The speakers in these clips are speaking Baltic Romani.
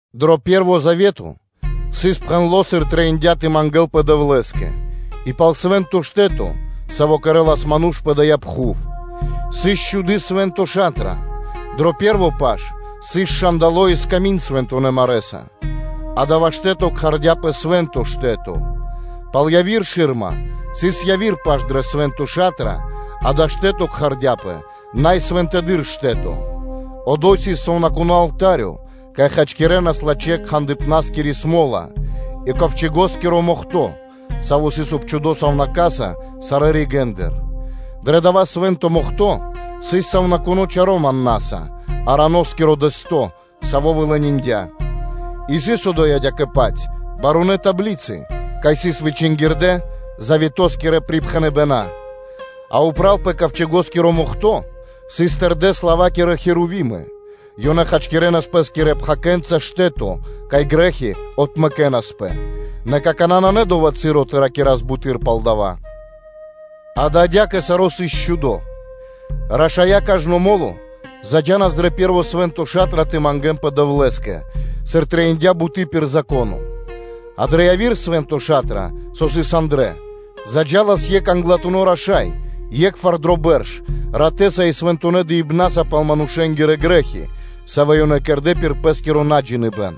Дро пэ́рво завето сыс пхэндло́, сыр трэиндя́ тэ мангэ́лпэ Дэвлэ́скэ, и пал свэ́нто штэ́то, саво́ кэрэ́лас ману́ш пэ дая́ пхув. Сыс чхуды́ Свэ́нто Ша́тра: дрэ пэ́рво паш сыс момолы́тко (свети́льнико) и сками́нд свэнцононэ́ марэ́са, дава́ штэ́то кхардяпэ Свэ́нто Штэ́то. Пал яви́р шы́рма сыс яви́р паш дрэ Свэ́нто Ша́тра, дава́ штэ́то кхардяпэ Най Свэнтэдыр Штэ́то. Одо́й сыс сувнакуно́ алта́рё, кай хачкирэнас лачхэ́-кхандыпна́скири смо́ла, и Ковчэго́скиро Мохто́/Мохтэ́н (Яшчыко) завето́са, саво́ сыс обчхудо сувнака́са сарэ́ ригэ́ндыр. Дро дава́ Свэ́нто Мохто́ сыс сувнакуно́ чаро́ маннаса, Ароноскиро дэсто́, саво́ вылениндя. И сыс одо́й адя́кэ-паць барунэ́ таблицы, кай сыс вычингирдэ заветоскирэ припхэныбэна́. А упра́л пэ Ковчэго́скиро Мохто́ сыс тэрдэ́ слава́кирэ херувимы. Ёнэ зачхакирэнас пэ́скирэ пхакэнца штэ́то, кай грэ́хи отмэкэнаспэ; нэ какана́ нанэ дова́ часо тэ ракирас буты́р пал дава́. Дава́ адя́кэ саро́ сыс счхудо: рашая́ кажно мо́ло заджанас дрэ пэ́рво Свэ́нто Ша́тра тэ мангэ́нпэ Дэвлэ́скэ, сыр трэиндя́ буты́ пир Зако́но, а дрэ яви́р Свэ́нто Ша́тра, сави́ сыс андра́л, заджалас екх Англатуно́ Раша́й, е́кхвар дро бэрш, ратэ́са и свэнтонэ́ дыибнаса пал манушэ́нгирэ грэ́хи, савэ́ ёнэ кэрдэ́ пир пэ́скиро наджиныбэн.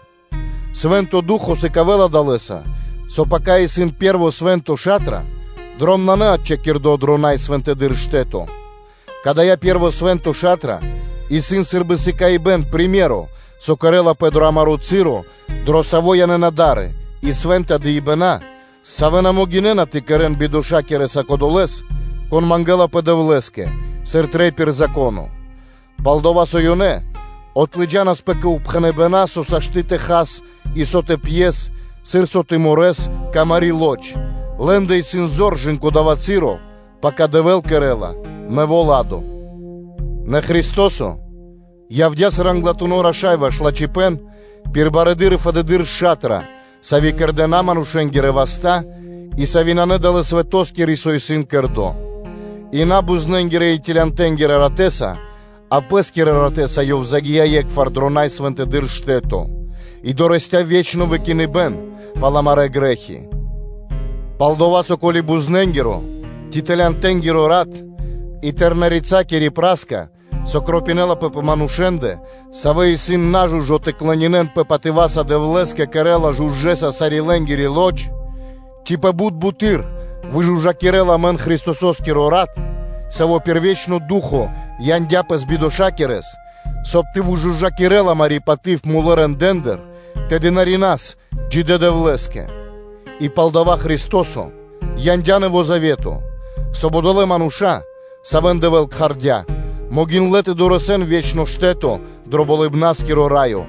Свэ́нто Ду́хо (Фа́но) сыкавэ́ла далэ́са, со пака исын пэ́рво Свэ́нто Ша́тра, дром нанэ отчхакирдо дро Най Свэнтэдыр Штэ́то; кадая́ пэ́рво Свэ́нто Ша́тра исын сы́рбы приме́ро (сыкаибэ́н), со кэрэ́лапэ дро амаро́ часо, дро саво́ янэ́на да́ры, и свэ́нта дыибэна́, савэ́ на могинэ́на тэ кэрэ́н бидошакирэса кодолэ́с, кон мангэлапэ Дэвлэ́скэ, сыр трэй пир Зако́но, пал-дова́ со ёнэ отлыджанаспэ кэ упхэныбэна́, со сашты́ тэ хас, и со тэ пьес, сыр со тэ морэс (тэ халавэс), кэ амари́ лоч (плоть), лэ́ндэ исын зор кэ/ жы́ко дава́ часо, пака Дэвэ́л кэрэ́ла нэво́ ладо (порядко). Нэ Христо́со явдя́, сыр Англатуно́ Раша́й ваш лачхипэ́н, саво́ явэ́ла анги́л барыдыршонэ и фэдыдыршонэ шатраса, сави́ кэрдэ́ на манушэ́нгирэ васта́, и сави́ нанэ далэ́ свэтоскири, со исын кэрдо́, и на бузнэ́нгирэ (козлэнгирэ) и целянтэ́нгирэ ратэ́са, а Пэ́скирэ ратэ́са Ёв загия́ е́кхвар дро Най Свэнтэдыр Штэ́то, и дорэсця́ ве́чно выкиныбэ́н пал амарэ́ грэ́хи. Пал-дова́ со, ко́ли бузнэ́нгиро ци целянтэ́нгиро рат и тэрнэ́-рэца́кири (тёлкакири) пра́ска (пепло), со кропинэлапэ пэ манушэ́ндэ, савэ́ исын нажужо тэ клонинэнпэ патыва́са Дэвлэ́скэ, кэрэ́ла жужа́са (чыстонаса) лэ́нгири лоч, то ци пэ бут бутэды́р выжужакирэ́ла амэн Христосо́скиро рат, Саво́ пир ве́чно Ду́хо (Фа́но) яндя́ Пэс бидоша́кирэс, соб (кай) тэ выжужакирэл амари́ паты́в мулэ́ рэндэ́ндыр тэ дынарина́с джидэ́ Дэвлэ́скэ? И палдава́ Христо́со яндя́ Нэво́ Завето, соб (кай) одолэ́ мануша́, савэ́н Дэвэ́л кхардя кэ Пэ прикхардя, могиндлэ́ тэ дорэсэн ве́чно штэ́то дро Болыбна́скиро Раё,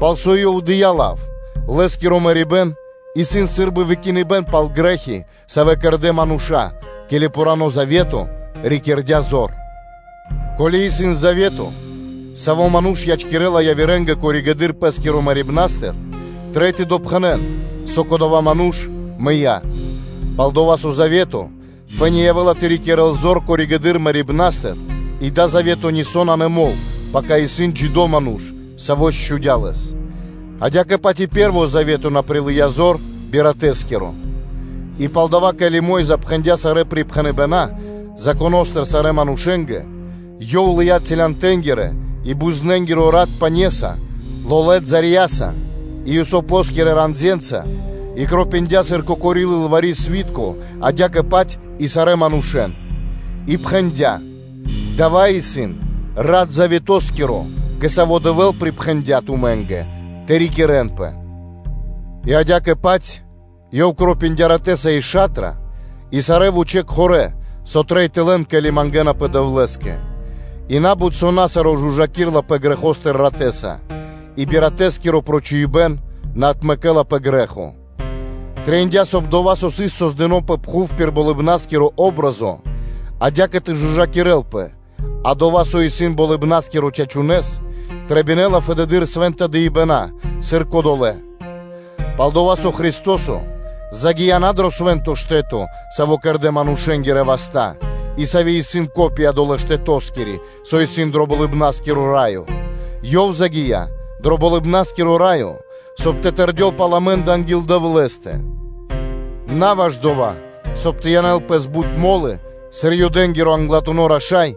пал со Ёв и дыя́ лав. Лэ́скиро мэрибэ́н исын сы́рбы выкиныбэ́н пал грэ́хи, савэ́ кэрдэ́ мануша́, ке́ли пхурано́ завето рикирдя зор. Ко́ли исын завето, саво́ ману́ш ячкирэ́ла явирэ́нгэ пало́ (после) пэ́скиро мэрибэ́н, трэй тэ допхэнэн, со кодова́ ману́ш мыя́. Пал-дова́ со завето фэ́ни явэ́ла тэ рикирэ́л зор пало́ (после) мэрибэ́н, и дава́ завето нисо́ нанэ мол, пака исын джидо́ ману́ш, саво́ счхудя лэс. Адя́кэ-паць и пэ́рво завето на прилыя́ зор би ратэ́скиро. И палдава́, ке́ли Мо́йза пхэндя́ сарэ́ припхэныбэна́ Законо́стыр сарэ́ манушэ́нгэ, ёв лыя́ целянтэнгирэ и бузнэнгиро (козлэнгиро) рат пане́са, лолэ́ балэнца и исопоскирэ ранденца, и кропиндя лэ́нца сыр кокори лылвари́-сви́тко, адя́кэ-паць и сарэ́ манушэ́н. И пхэндя́: “Дава́ исын рат завето́скиро, кэ саво́ Дэвэ́л припхэндя́ тумэ́нгэ тэ рикирэнпэ.” И адя́кэ-паць ёв кропиндя ратэ́са и ша́тра и сарэ́ кхорэ́ (сосуды), со трэй тэ лэн, ке́ли мангэ́напэ Дэвлэ́скэ. И на́бут со на саро́ жужакирэлапэ грэхостыр ратэ́са, и би ратэскиро прочхуибэн на отмэкэлапэ грэ́хо. Трэиндя́, соб (кай) дова́, со сыс создыно́ пэ пхув пир болыбна́скири патри́н (о́бразо), адя́кэ тэ жужакирэлпэ, а дова́, со исын Болыбна́скиро чачунэ́с, трэбинэла фэды́р свэ́нта дыибэна́, сыр кодолэ́. Пал-дова́ со Христо́со загия́ на дрэ Свэ́нто Штэ́то, саво́ кэрдэ́ манушэ́нгирэ васта́, и саво́ исын патри́н (копия) долэ́ Штэтоскиро, со исын дро Болыбна́скиро Раё. Ёв загия́ дро Болыбна́скиро Раё, соб (кай) тэ тэрдёл пал амэ́ндэ анги́л Дэвлэ́стэ: на ваш дова́, соб (кай) тэ янэл Пэс бут мо́лы, сыр Юдэ́нгиро англатуно́ раша́й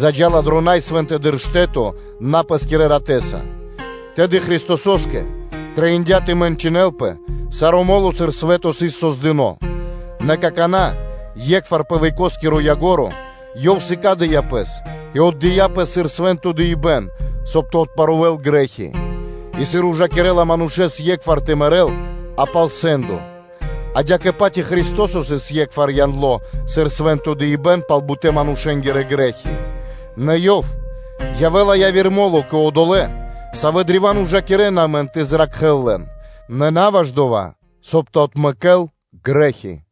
заджа́ла дро Най Свэнтэдыр Штэ́то на пэ́скирэ ратэ́са; тэды Христосо́скэ трэиндя́ тэ мэнчынэлпэ кажно мо́ло, сыр свэ́то сыс создыно́. Нэ какана́, е́кхвар пэ векоскиро ко́нцо (яго́ро), Ёв сыкадя́ Пэс и отдыя́ Пэс сыр свэ́нто дыибэ́н, соб (кай) тэ отпарувэл грэ́хи. И сыр ужакирэ́ла манушэ́с е́кхвар тэ мэрэ́л, а пало́ дава́ сэ́ндо; адя́кэ-паць и Христо́со сыс е́кхвар яндло сыр свэ́нто дыибэ́н пал бутэ́-манушэ́нгирэ грэ́хи. Нэ Ёв явэ́ла яви́р мо́ло кэ одолэ́, савэ́ древа́н ужакирэ́на Лэс тэ зракхэ́л лэн, нэ на ваш дова́, соб (кай) тэ отмэкэ́л грэ́хи.